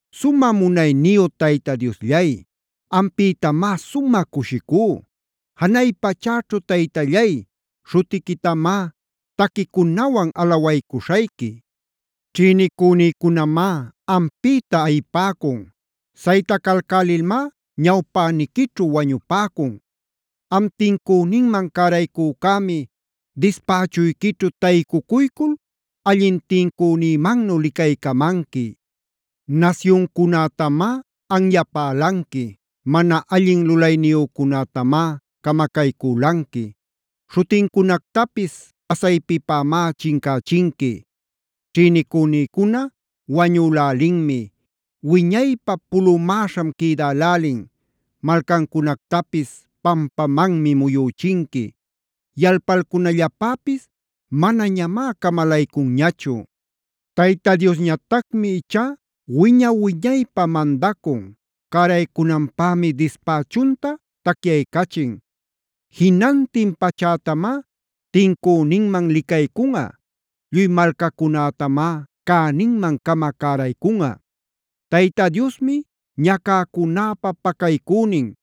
Sumä munayniyu Tayta Diosllay, ampïtamá sumä cushicú. Janay pachäćhu Taytallay, śhutiquitamá taquicunawan alawaycuśhayqui. Ćhïnicünïcunamá ampïta ayipäcun. Saytacälälilmá ñawpäniquićhu wañüpäcun. Am tincüninman caraycücämi dispächuyquićhu taycucuycul allin tincünïmannu licaycamanqui. Nasyuncunätamá anyapälanqui. Mana allin lulayniyücunätamá camacaycülanqui. Śhutincunactapis pasaypipämá chincächinqui. Ćhïnicünïcuna wañülälinmi. Wiñaypä pulumäśham quïdälälin. Malcancunactapis pampamanmi muyüchinqui. Yalpalcunallapäpis manañamá camalaycunñachu. Tayta Diosñatacmi ichá wiña-wiñaypä mandacun; cäraycunanpämi dispächunta tacyaycachin. Jinantin pachätamá tincüninman licaycunꞌa. Lluy malcacunätamá cäninman-cama cäraycunꞌa. Tayta Diosmi ñacäcunäpä pacaycünin;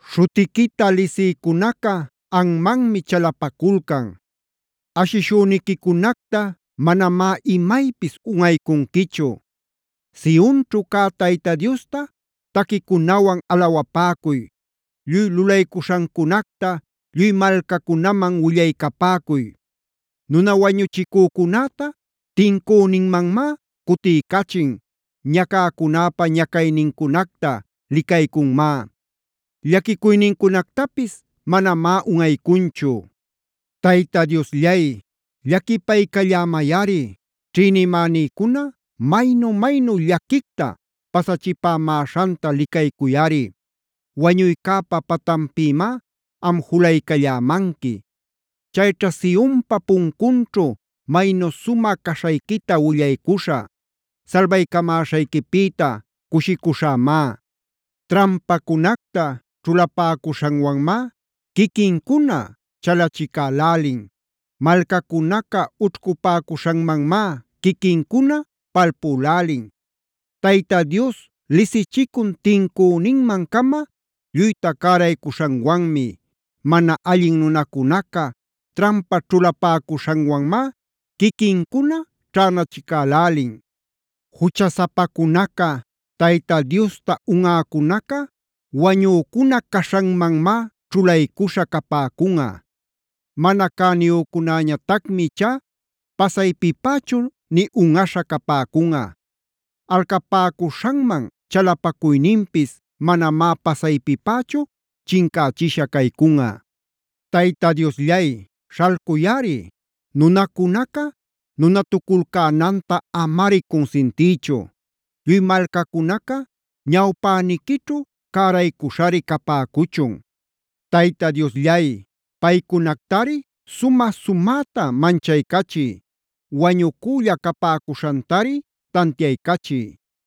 Śhuquita lisïcunaca anmanmi chalapaculcan. Ashishüniquicunacta manamá imaypis unꞌaycunquichu. Sionćhu cä Tayta Diosta taquicunawan alawapäcuy; lluy lulaycuśhancunacta lluy malcacunaman willaycapäcuy. Nuna wañuchicücunäta tincüninmanmá cutiycachin, ñacäcunäpa ñacaynincunacta licaycunmá, llaquicuynincunactapis manamá unꞌaycunchu. Tayta Diosllay, llaquipaycallämayꞌari; ćhïnimänïcuna maynu-maynu llaquicta pasachipämäśhanta licaycuyꞌari. Wañuycäpa patanpïmá am julaycallämanqui. Chayćha Sionpac puncunćhu maynu sumä caśhayquita willaycuśhä. Salbaycamäśhayquipïta cushicuśhämá. Trampacunacta ćhulapäcuśhanwanmá quiquincuna chalachicälälin. Malcacunaca ućhcupäcuśhanmanmá quiquincuna palpülälin. Tayta Dios lisichicun tincüninman-cama lluyta cäraycuśhanwanmi. Mana allin nunacunaca trampa ćhulapäcuśhanwanmá quiquincuna ćhänachicälälin. Juchasapacunaca, Tayta Diosta unꞌäcunaca wañücuna caśhanmanmá ćhulaycuśha capäcunꞌa. Mana cäniyücunätañatacmi ichá pasaypipächu nï unꞌaśha capäcunꞌa. Alcapäcuśhanman chalapacuyninpis manamá pasaypipächu chincächisha caycunꞌa. Tayta Diosllay, śhalcuyꞌari; nunacunaca nunatuculcänanta amari cunsintiychu. Lluy malcacunaca ñawpäniquićhu cäraycuśhari capäcuchun. Tayta Diosllay, paycunactari sumä-sumäta manchaycachiy. Wañucülla capäcuśhantari tantiaycachiy.